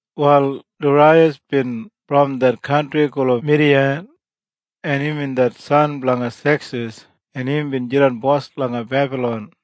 Wal Daraiyas bin brom det kantri gulum Midiya, en imbin det san blanga Seksis en imbin jidan bos langa Bebalon.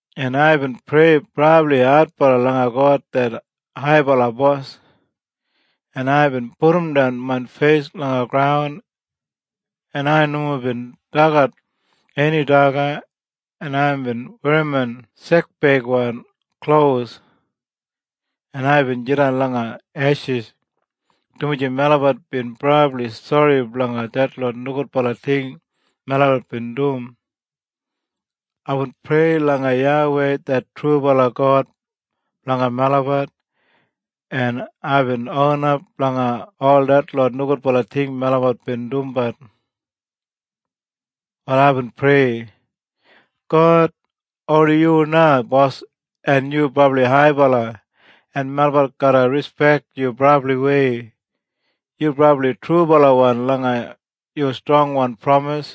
En aibin prei brabli adbala langa God det haibala Bos, en aibin pudumdan main feis langa graun, en ai nomo bin dagat eni daga, en aibin werrimon sekbeigwan klos, en aibin jidan langa eshis, dumaji melabat bin brabli sori blanga detlot nogudbala ting melabat bin dum. Aibin prei langa YAWEI det trubala God blanga melabat, en aibin onap blanga ol detlot nogudbala ting melabat bin dumbat. Wal aibin prei, “God, oni yu na Bos en yu brabli haibala en melabat garra rispek yu brabliwei. Yu brabli trubalawan langa yu strongwan pramis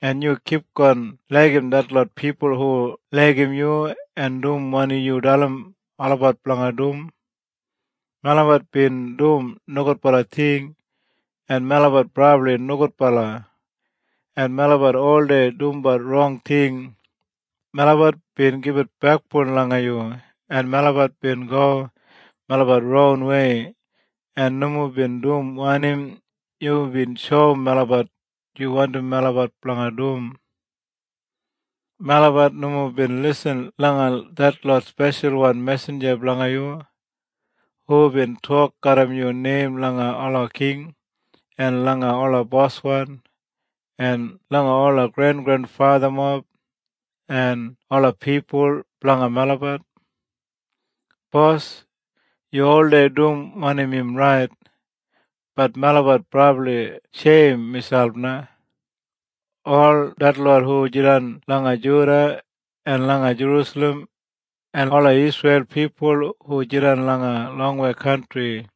en yu kipgon laigim detlot pipul hu laigim yu en dum wanim yu dalim olabat blanga dum. Melabat bin dum nogudbala ting, en melabat brabli nogudbala, en melabat oldei dum rong ting. Melabat bin gibit bekboun langa yu, en melabat bin go melabat ronwei en nomo bin dum wanim yubin shoum melabat yu wandim melabat blanga dum. Melabat nomo bin lisin langa detlot speshalwan mesinja blanga yu, hubin tok garram yu neim langa ola king, en langa ola boswan, en langa ola grengrenfathamob, en ola pipul blanga melabat. “Bos, yu oldei dum wanim im rait, bat melabat brabli sheim miselp na. Ol detlot hu jidan langa Juda en langa Jerusalem en ola Isreil pipul hu jidan langa longwei kantri,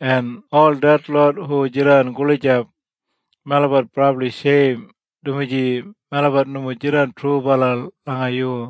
en ol detlot hu jidan gulijap, melabat brabli sheim, dumaji melabat nomo jidan trubala langa yu.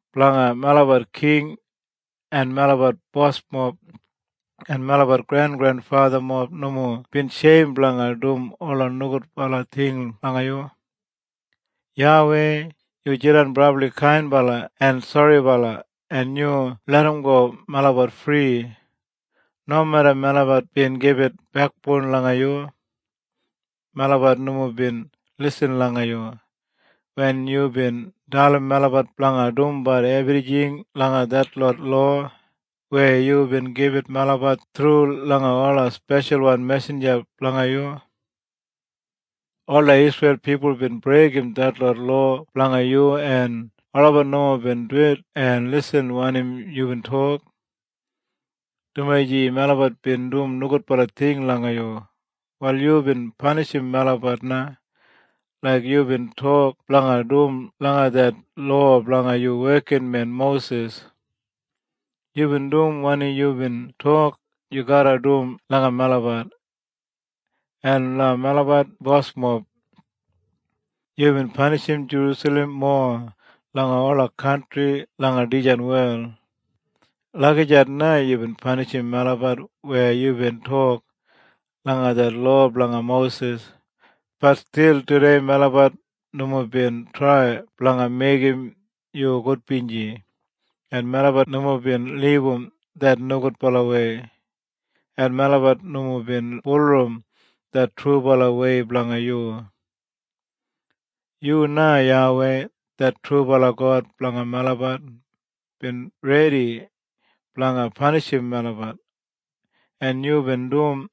Blanga melabat king en melabat bosmob en melabat grengrenfathamob nomo bin sheim blanga dum ola nogudbala ting langa yu. YAWEI, yu jidan brabli kainbala en soribala en yu larramgo melabat fri, nomeda melabat bin gibit bekboun langa yu. Melabat nomo bin lisin langa yu, wen yubin dalim melabat blanga dumbat ebrijing langa detlot lowa weya yubin gibit melabat thru langa ola speshalwan mesinja blanga yu. “Ola Isreil pipul bin breigim detlot lowa blanga yu en olabat nomo bin duwit en lisin wanim yubin tok. Dumaji melabat bin dum nogudbala ting langa yu, wal yubin panishim melabat na laik yubin tok blanga dum langa det lowa blanga yu wekinmen Mosis. Yubin dum wanim yubin tok yu garra dum langa melabat, en langa melabat bosmob. Yubin panishim Jerusalem mowa langa ola kantri langa dijan wel. Lagijat na yubin panishim melabat weya yubin tok langa det lowa blanga Mosis. Bat stil tudei melabat nomo bin trai blanga meigim yu gudbinji, en melabat nomo bin libum det nogudbalawei, en melabat nomo bin bulurrum det trubalawei blanga yu. Yu na YAWEI det trubala God blanga melabat bin redi blanga panishim melabat, en yubin dum,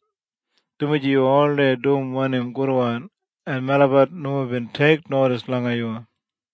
dumaji yu oldei dum wanim gudwan, en melabat nomo bin teiknodis langa yu.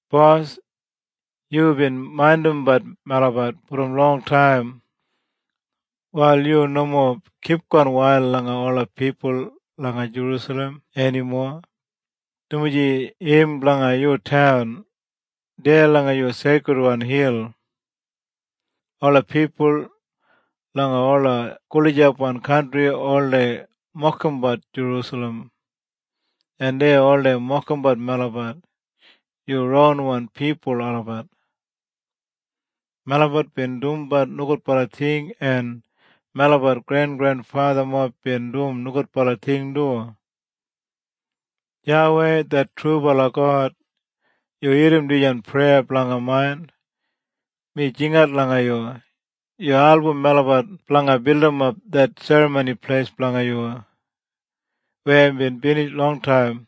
Bos, yubin maindimbat melabat brom longtaim. Wal yu nomo kipgon wail langa ola pipul langa Jerusalem enimo, dumaji im blanga yu taun, deya langa yu seikridwan hil. Ola pipul langa ola gulijapwan kantri oldei mokimbat Jerusalem. En dei oldei mokimbat melabat, yu ronwan pipul olabat. Melabat bin dumbat nogudbala ting en melabat grengrenfathamob bin dum nogudbala ting du. “YAWEI det trubala God, yu irrim dijan preya blanga main. Mi jingat langa yu. Yu album melabat blanga bildimap det Serramoni Pleis blanga yu, weya bin binij longtaim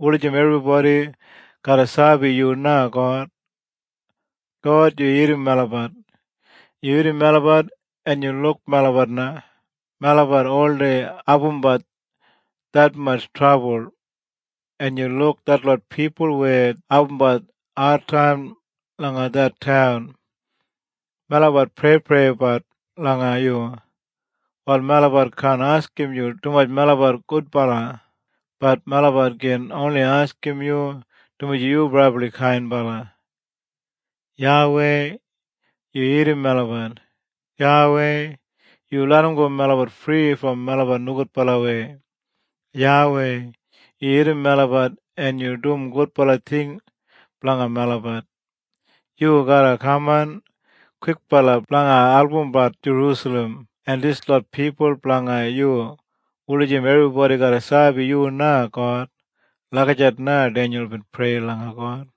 wulijim ebribodi garra sabi yu na God. God, yu irrim melabat. Yu irrim melabat en yu luk melabat na. Melabat oldei abumbat detmatj trabul. En yu luk detlot pipul weya abumbat adtaim langa det taun. Melabat preipreibat langa yu. Wal melabat kaan askim yu dumaji melabat gudbala, bat melabat gin oni askim yu dumaji yu brabli kainbala. YAWEI, yu irrim melabat! YAWEI, yu larramgo melabat fri brom melabat nogudbalawei! YAWEI, yu irrim melabat en yu dum gudbala ting blanga melabat! Yu garra kaman kwikbala blanga albumbat Jerusalem en dislot pipul blanga yu wulijim ebribodi garra sabi yu na God.” Lagijat na Denyul bin prei langa God.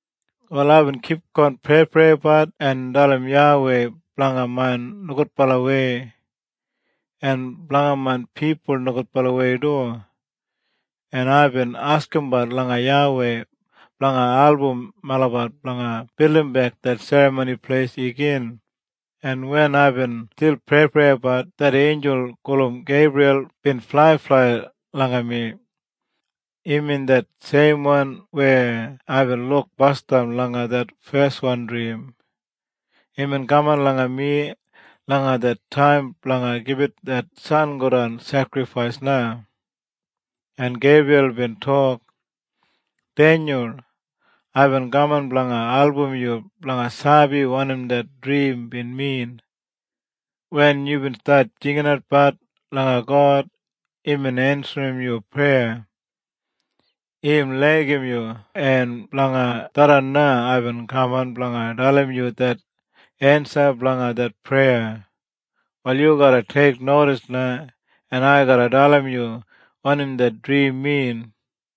Wal aibin kipgon preipreibat en dalim YAWEI blanga main nogudbalawei, en blanga main pipul nogudbalawei du, en aibin askimbat langa YAWEI blanga album melabat blanga bildimbek det Serramoni Pleis igin. En wen aibin stil preipreibat det einjul gulum Geibriyal bin flaiflai langa mi. Imbin det seimwan weya aibin luk basdam langa det feswan drim. Imbin kaman langa mi langa det taim blanga gibit det sangodan sekrifais na. En Geibriyal bin tok, “Denyul, aibin kaman blanga album yu blanga sabi wanim det drim bin min. Wen yubin stat jinginatbat langa God imbin ensim yu preya. Im laigim yu en blanga tharran na aibin kaman blanga dalim yu det ensa blanga det preya. Wal yu garra teiknodis na en ai garra dalim yu wanim det drim min.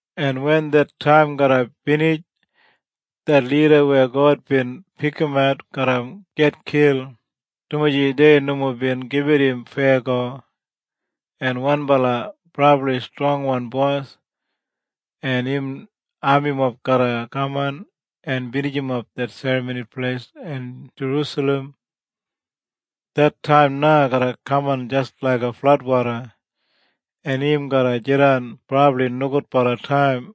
En wen det taim garra binij det lida weya God bin pikimat garra gitkil, dumaji dei nomo bin gibit im feyago. En wanbala brabli strongwan bos en im amimob garra kaman en binijimap det Serramoni Pleis en Jerusalem. Det taim na garra kaman jis laiga fladwoda, en im garra jidan brabli nogudbala taim.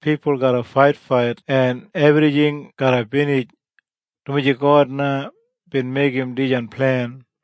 Pipul garra faitfait en ebrijing garra binij. Dumaji God na bin meigim dijan plen.